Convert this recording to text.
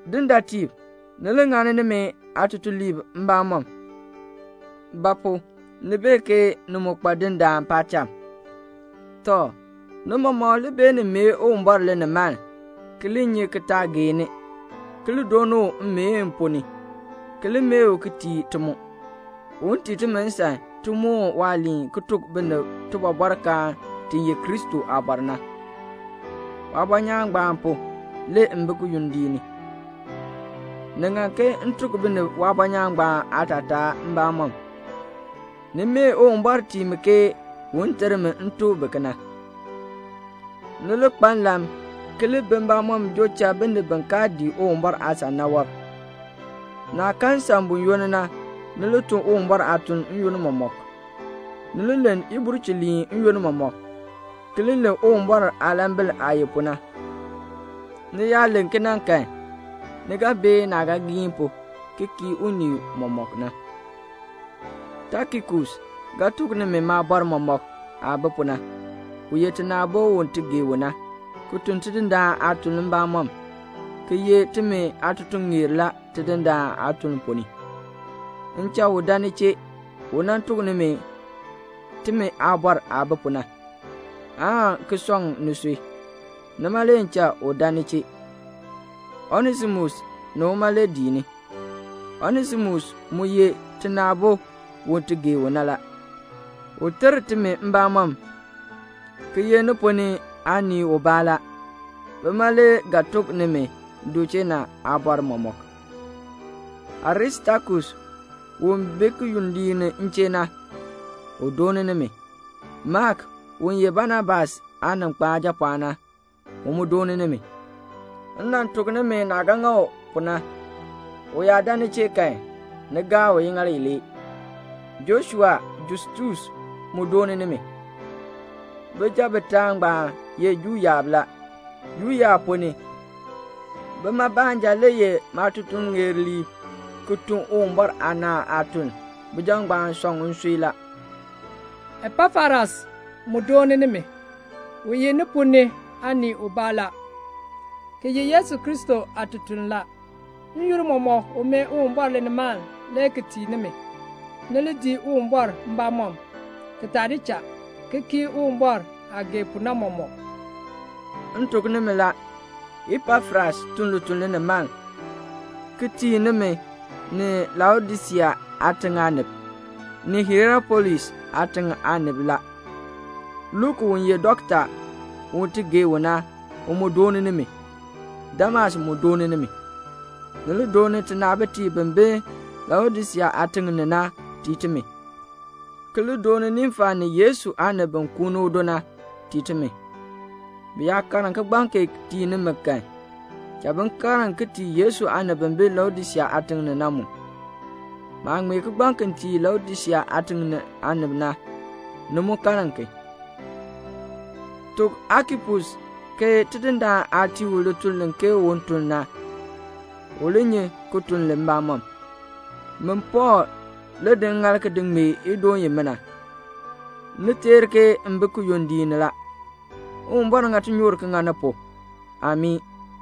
Dindaatiib, ni li ŋani nimi aatutuliib mbamɔm; ba pu? ni bee ke ni mu kpa Dindaan paacham. Tɔ, ni mɔmɔk li beenin mee Uwumbɔr linimaln, ki li nyi ki taa geeni, ki li dooni u mmeen ponn ni, ki li mee u ki tii ti mu, un tii timi nsan ti moon waaliin ki tuk binib tibɔbɔrkaan ti ye Kristo aabɔr na. Waabɔnyaan ngbaan pu, le m bi kiyondiik ni. Ni ŋan ke m tuk binib waabɔnyaan ngbaan aatataa mbamɔm. Ni mee Uwumbɔr tii mi ke un ter mi m tuk bi kena. Ni li kpa nlan ki li bi mbamɔm joo cha binib bi kaa dii Uwumbɔr aasan na wɔb. Naah kan nsan buyoonn na, ni tun Uwumbɔr aatuln n-yoonn mɔmɔk. Ni li len ibulchiliin n-yoonn mɔmɔk, ki li len Uwumbɔr aalambil aah ye pu na. Ni yaa len kena kan, ni ga bee naah ga giin pu ki kii unii mɔmɔk na. Tikikus ga tuk nimi maabɔr mɔmɔk aah bi pu na. U ye tina aabo u ti gee u na, ki tun Tidindaan aatuln mbamɔm, ki ye timi aatutuŋeer la Tidindaan aatuln ponn ni. M cha u buen ni chee, u nan tuk nimi timi aabɔr aah bi pu na, aan ki sɔŋ nisui. Nima le m cha u buen ni chee. Onesimus ni uma le dii ni. Onesimus mu ye tina aabo u ti gee u na la. U ter timi mbamɔm, ki ye ni ponn ni aanii ubaa la. Bima le ga tuk nimi du chee na aabɔr mɔmɔk. Aristakus u bi kiyondiik ni m chee na, u dooni nimi. Mak, u ye Banabas aaninkpan aajapɔɔn na, u mu dooni nimi. M nan tuk nimi naah ga ŋa u pu na. U yaa dan ni chee kan, ni gaa u iŋaal ilee. Joshua Justus mu dooni nimi. Bijab bitaa ngbaan ye Juu yaab la. Juu yaab ponn ni, bima baanja le ye maatutuŋeerliib ki tun Uwumbɔr aanaan aatuln. Bijab ngbaan sɔŋ nsui la. Epafras mu dooni nimi. U ye ni ponn ni aanii ubaa la, ki ye Yesu Kristo aatutuln la. N-yoonn mɔmɔk u mee Uwumbɔr linimaln le ki tii nimi, ni li dii Uwumbɔr mbamɔm, ki taa di cha, ki kii Uwumbɔr aah gee pu na mɔmɔk. M tuk nimi la, Epafras tun lituln linimaln, ki tii nimi, ni Laodisea aatiŋ aanib, ni Hierapolis aatiŋ aanib la. Luk u ye dɔkta, u ti gee u na, u mu dooni nimi. Demas mu dooni nimi. Ni li dooni tinaabitiib bi bi Laodisea aatiŋ ni na tii timi, ki li dooni Nimfa ni Yesu aanib bi kuuni udo na, tii timi. Bi yaa karn kigbaŋ kee tii nimi kan, cha bi karn ki tii Yesu aanib bi bi Laodisea aatiŋ ni na mu. Maah ŋmee kigbaŋ ki tii Laodisea aatiŋ aanib na, ni mu karn ki. Tuk Akipus ke Tidindaan aah tii u lituln ke un tun na, u li nyi ki tun li mbamɔm. Min Pɔɔl le di ŋŋaal ki ŋmee idoon imina. Ni teer ke m bi kiyondiik ni. Uwumbɔr ŋa tinyoor ŋa ni pu. [Amii.]